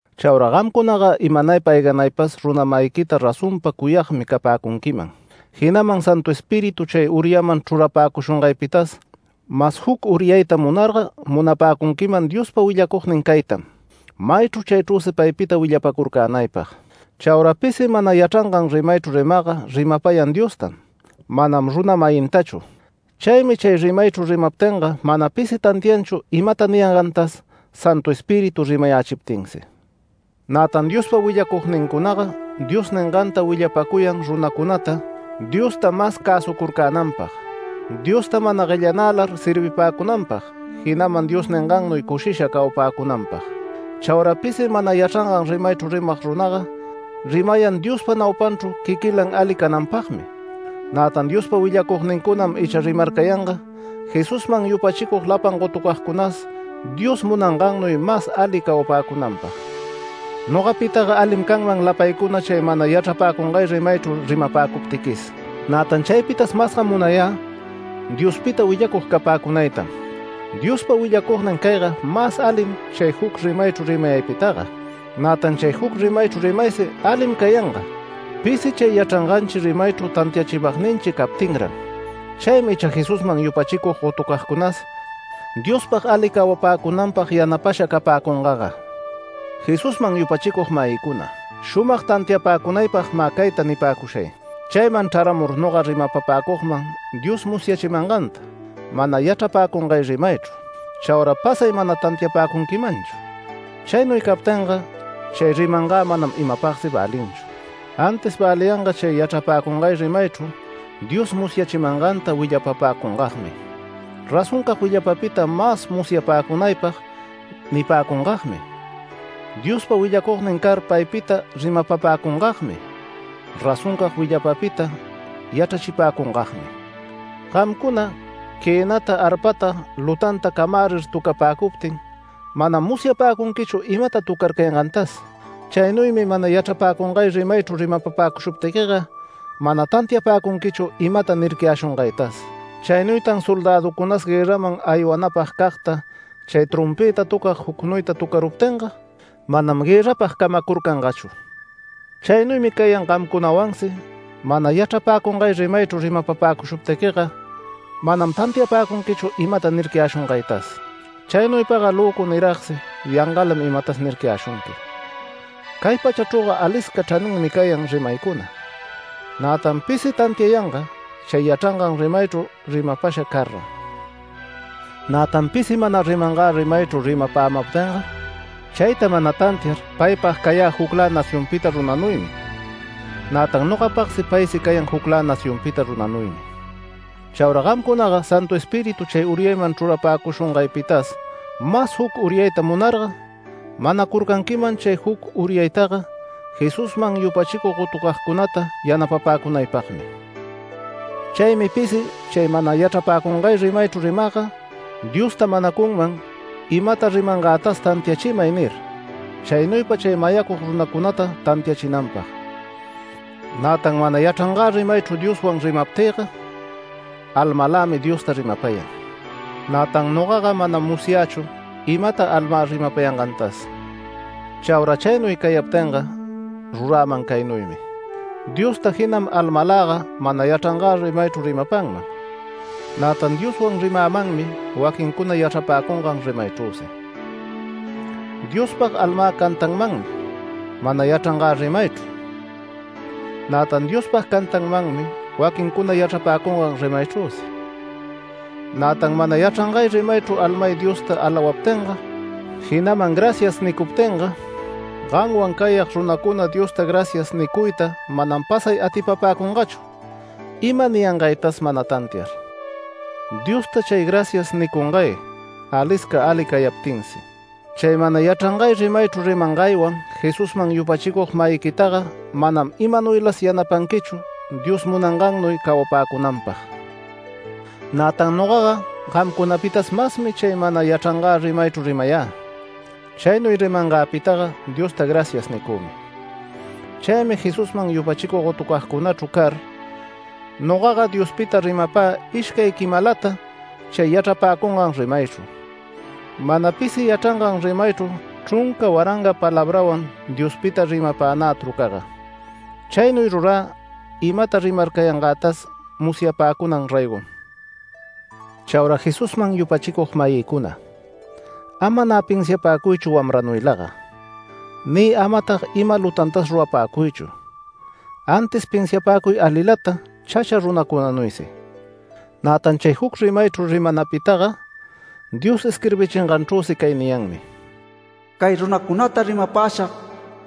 Chaura gamcunaga imanaypa ayganaypas runa-mayiquita razonpa cuyagmi capäcunquiman, jinaman Santu Espíritu chay uryaman chrurapäcushungaypitas mas juc uryayta munarga munapäcunquiman Diospa willacugnin caytam, maychru chaychrüsi paypita willapacurcänaypag. Chaura pisi mana yachrangan rimaychru rimagga rimapayan Diostam, manam runa-mayintachu. Chaymi chay rimaychru rimaptinga mana pisi tantianchu imata niyangantas Santu Espíritu rimayächiptinsi. Nätan Diospa willacugnincunaga Dios ningantam willapacuyan runacunata, Diosta mas cäsucurcänanpag, Diosta mana guellanälar servipäcunanpag, jinaman Dios ningannuy cushisha cawapäcunanpag. Chaura pisi mana yachrangan rimaychru rimag runaga rimayan Diospa naupanchru quiquilan ali cananpagmi. Nätan Diospa willacugnincunam icha rimarcayanga Jesusman yupachicug lapan gotucagcunas Dios munangannuy mas ali cawapäcunanpag Nogapitaga alim canman lapaycuna chay mana yachrapäcungay rimaychru rimapäcuptiquis. Nätan chaypitas masga munayä Diospita willacug capäcunaytam, Diospa willacugnin cayga mas alim chay juc rimaychru rimayaypitaga. Nätan chay juc rimaychru rimaysi ali cayanga pisi chay yachranganchi rimaychru tantiachimagninchi captinran. Chaymi icha Jesusman yupachicug gotucagcunas Diospag ali cawapäcunanpag yanapasha capäcungaga. Jesusman yupachicug-mayïcuna, shumag tantiapäcunaypag mä cayta nipäcushay: Chayman chraramur noga rimapapäcugman Dios musyachimanganta, mana yachrapäcungay rimaychru. Chaura pasay mana tantiapäcunquimanchu. Chaynuy captinga chay rimangä manam imapagsi välinchu. Antis väliyanga chay yachrapäcungay rimaychru Dios musyachimanganta willapapäcungagmi, razoncag willapapita mas musyapäcunaypag nipäcungagmi. Diospa willacugnin car paypita rimapapäcungagmi, razoncag willapapita yachrachipäcungagmi. Gamcuna quënata, arpata lutanta camärir töcapäcuptin manam musyapäcunquichu imata töcarcayangantas. Chaynuymi mana yachrapäcungay rimaychru rimapapäcushuptiquiga mana tantiapäcunquichu imata nircayäshungaytas. Chaynuytan soldäducunas guërraman aywanapagcagta chay trompëta töcag jucnuyta töcaruptinga, manam guërrapag camacurcangachu. Chaynuymi cayan gamcunawansi, mana yachrapäcungay rimaychru rimapapäcushuptiquiga manam tantiapäcunquichu imata nircayäshungaytas. Chaynuypaga löcu niragsi yangalam imatas nircayäshunqui. Cay pachachrüga alisca chraninmi cayan rimaycuna, nätan pisi tantiayanga chay yachrangan rimaychru rimapasha car-ran. Nätan pisi mana rimangä rimaychu rimapämaptinga, chayta mana tantiar paypag cayä juclä nacionpita runanuymi, nätan nogapagsi paysi cayan juclä nacionpita runanuymi. Chaura gamcunaga Santu Espíritu chay uryayman chrurapäcushungaypitas mas juc uryayta munarga, manacurcanquiman chay juc uryaytaga, Jesusman yupachicug gotucagcunata yanapapäcunaypagmi. Chaymi pisi chay mana yachrapäcungay rimaychru rimagga, Diosta manacunman, imata rimangätas “Tantiachimay” nir, chaynuypa chay mayacug runacunata tantiachinanpag. Nätan mana yachrangä rimaychru Dioswan rimaptïga almalämi Diosta rimapayan, nätan nogaga manam musyächu imata almä rimapayangantas. Chaura chaynuy cayaptinga ruräman caynuymi; Diosta jinam almaläga mana yachrangä rimaychru rimapanman, nätan Dioswan rimämanmi waquincuna yachrapäcungan rimaychrüsi. Diospag almä cantanmanmi mana yachrangä rimaychru, nätan Diospag cantämanmi waquincuna yachrapäcungan rimaychrüsi. Nätan mana yachrangay rimaychru almay Diosta alawaptinga, jinaman “Gracias” nicuptinga, gamwan cayag runacuna Diosta “Gracias” nicuyta manam pasay atipapäcungachu ima niyangaytas mana tantiar. Diosta chay “Gracias” nicungay alisca ali cayaptinsi. Chay mana yachrangay rimaychru rimangaywan Jesusman yupachicug-mayiquitaga manam imanuylas yanapanquichu Dios munangannuy cawapäcunanpag. Nätan nogaga gamcunapitas masmi chay mana yachrangä rimaychru rimayä. Chaynuy rimangäpitaga Diosta “Gracias” nicümi. Chaymi Jesusman yupachicug gotucagcunachru car nogaga Diospita rimapä ishcay quimalata chay yachrapäcungan rimaychru, mana pisi yachrangan rimaychru chrunca waranga palabrawan Diospita rimapanä trucaga. Chaynuy rurä imata rimarcayangätas musyapäcunan raygom. Chaura Jesusman yupachicug-mayïcuna, ama nä pinsiapäcuychu wamranuylaga, ni amatag ima lutantas rurapäcuychu. Antis pinsiapäcuy alilata chacha runacunanuysi. Nätan chay juc rimaychru rimanapitaga Dios isquirbichinganchrüsi cay niyanmi: “Cay runacunata rimapäshag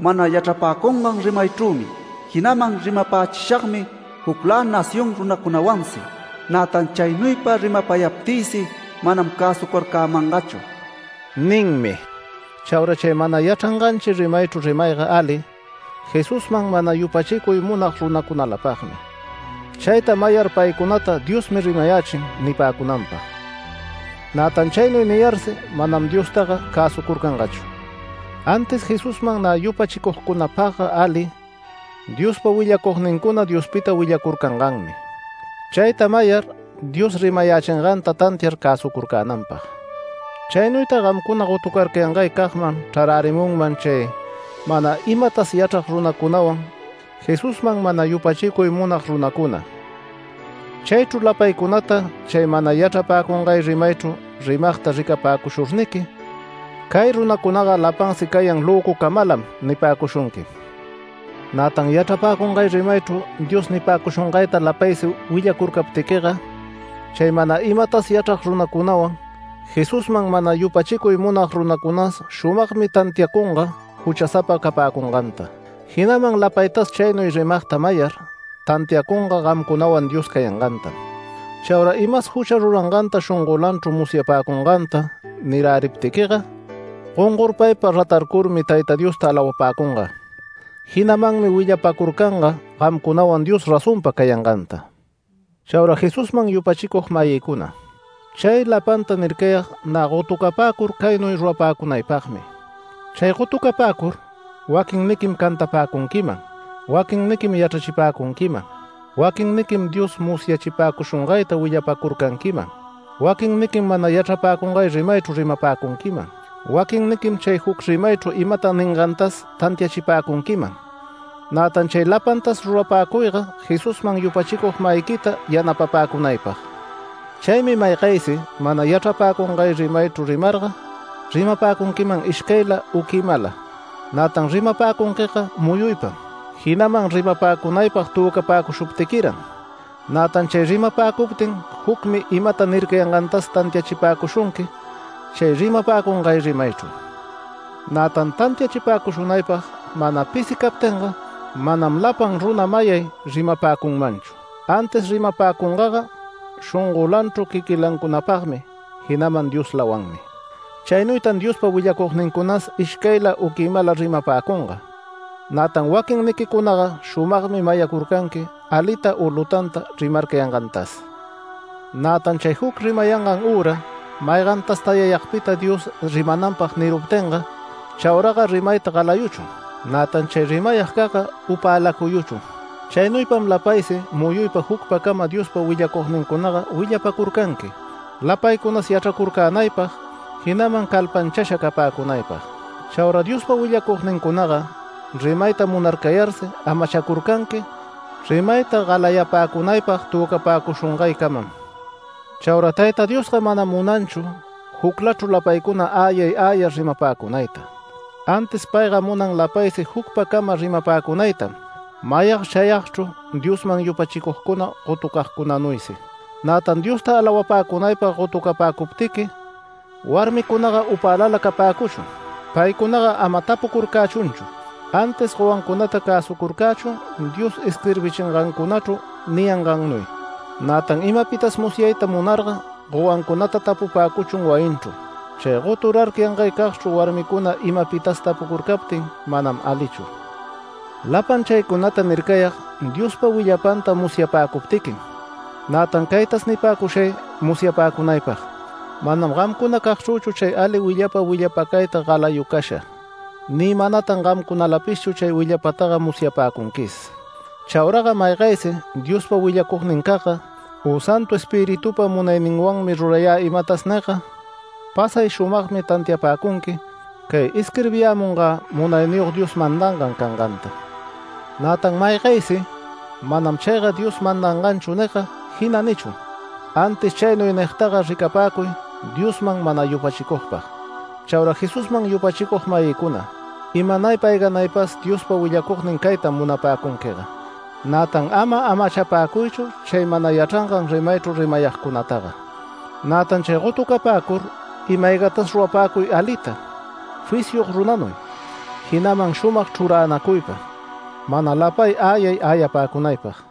mana yachrapäcungan rimaychrümi, jinaman rimapächishagmi juclä nación runacunawansi. Nätan chaynuypa rimapayaptïsi manam cäsucarcämangachu” ninmi. Chaura chay mana yachranganchi rimaychru rimayga ali, Jesusman mana yupachicuy munag runacunalapagmi, chayta mayar “Paycunata Diosmi rimayächin” nipäcunanpag. Nätan chaynuy niyarsi manam Diostaga cäsucurcangachu. Antis Jesusman nä yupachicugcunapagga ali, Diospa willacugnincuna Diospita willacurcanganmi, chayta mayar Dios rimayächinganta tantiar cäsucurcänanpag. Chaynuytag gamcuna goturarcayangaycagman chrarärimunman chay mana imatas yachrag runacunawan Jesusman mana yupachicuy munag runacuna. Chaychru lapaycunata chay mana yachrapäcungay rimaychru rimagta ricapäcushurniqui “Cay runacunaga lapansi cayan löcucamalam” nipäcushunquim. Nätan yachrapäcungay rimaychru Dios nipäcushungayta lapaysi willacurcaptiquiga, chay mana imatas yachrag runacunawan, Jesusman mana yupachicuy munag runacunas shumagmi tantiacunga juchasapa capäcunganta, jinaman lapaytas chaynuy rimagta mayar tantiacunga gamcunawan Dios cayangantam. Chaura imas jucha ruranganta shongolanchru musyapäcunganta niräriptiquiga, gongorpaypa ratarcurmi Tayta Diosta alawapäcunga. Jinamanmi willapacurcanga gamcunawan Dios razonpa cayanganta. Chaura Jesusman yupachicug-mayïcuna, chay lapanta nircayag nä gotucapäcur caynuy rurapäcunaypagmi; chay gotucapäcur waquinniquim cantapäcunquiman, waquinniquim yachrachipäcunquiman, waquinniquim Dios musyachipäcushungayta willapacurcanquiman, waquinniquim mana yachrapäcungay rimaychru rimapäcunquiman, waquinniquim chay juc rimaychru imata ningantas tantiachipäcunquiman. Nätan chay lapantas rurapäcuyga Jesusman yupachicug-mayiquita yanapapäcunaypag. Chaymi maygaysi mana yachrapäcungay rimaychu rimarga rimapäcunquiman ishcayla u quimala. Nätan rimapäcunquiga muyuypam, jinaman rimapäcunaypag töcapäcushuptiquiran. Nätan chay rimapäcuptin jucmi imata nircayangantas tantiachipäcushunqui chay rimapäcungay rimaychu. Nätan tantiachipäcushunaypag mana pisi captinga, manam lapan runa mayay rimapäcunmanchu, antis rimapäcungaga shongolanchru quiquincunalapagmi, jinaman Dioslawanmi. Chaynuytan Diospa willacugnincunas ishcayla u quimala rimapäcunga, nätan waquinniquicunaga shumagmi mayacurcanqui alita u lutanta rimarcayangantas. Nätan chay juc rimayangan üra maygantas tayayagpita Dios rimananpag niruptinga. Chauraga rimayta galayuchun, nätan chay rimayagcagga upäläcuyuchun. Chaynuypam lapaysi muyuypa jucpacama Diospa willacugnincunaga willapacurcanqui, lapaycunas yachracurcänaypag, jinaman calpanchasha capäcunaypag. Chaura Diospa willacugnincunaga rimayta munarcayarsi amachacurcanqui rimayta galayapäcunaypag töcapäcushungaycamam. Chaura Tayta Diosga manam munanchu juclachru lapaycuna äyay äyar rimapäcunayta, antis payga munan lapaysi jucpacama rimapäcunaytam, mayag chayagchru Diosman yupachicugcuna gotucagcunanuysi. Nätan Diosta alawapäcunaypag gotucapäcuptiqui, warmicunaga upälala capäcuchun. Paycunaga ama tapucurcächunchu. Antis gowancunata cäsucurcächun Dios isquirbichingancunachru niyangannuy. Nätan imapitas musyayta munarga gowancunata tapupäcuchun wayinchru. Chay goturarcayangaycagchru warmicuna imapitas tapucurcaptin manam alichu. Lapan chaycunata nircayag Diospa willapanta musyapäcuptiquim. Nätan caytas nipäcushay musyapäcunaypag: Manam gamcunacagchrüchu chay ali willapa willapacayta galayucasha ni manatan gamcunalapishchu chay willapapitaga musyapäcunquis. Chauraga maygaysi “Diospa willacugnincagga, u Santu Espiritupa munayninwanmi rurayä imatas” nigga, pasay shumagmi tantiapäcunqui cay isquirbiyämungä Munayniyog Dios mandangan canganta. Nätan maygaysi “Manam chayga Dios mandanganchu” nigga, jina nichun. Antis chaynuy nigtaga ricapäcuy Diosman mana yupachicugpag. Chaura Jesusman yupachicug-mayïcuna, imanaypa ayganaypas Diospa willacugnin caytam munapäcunquiga. Nätan ama amachapäcuychu chay mana yachrangan rimaychru rimayagcunataga. Nätan chay gotucapäcur ima-aygatas rurapäcuy alita, fisyog runanuy, jinaman shumag chruranacuypa, mana lapay äyay äyapäcunaypag.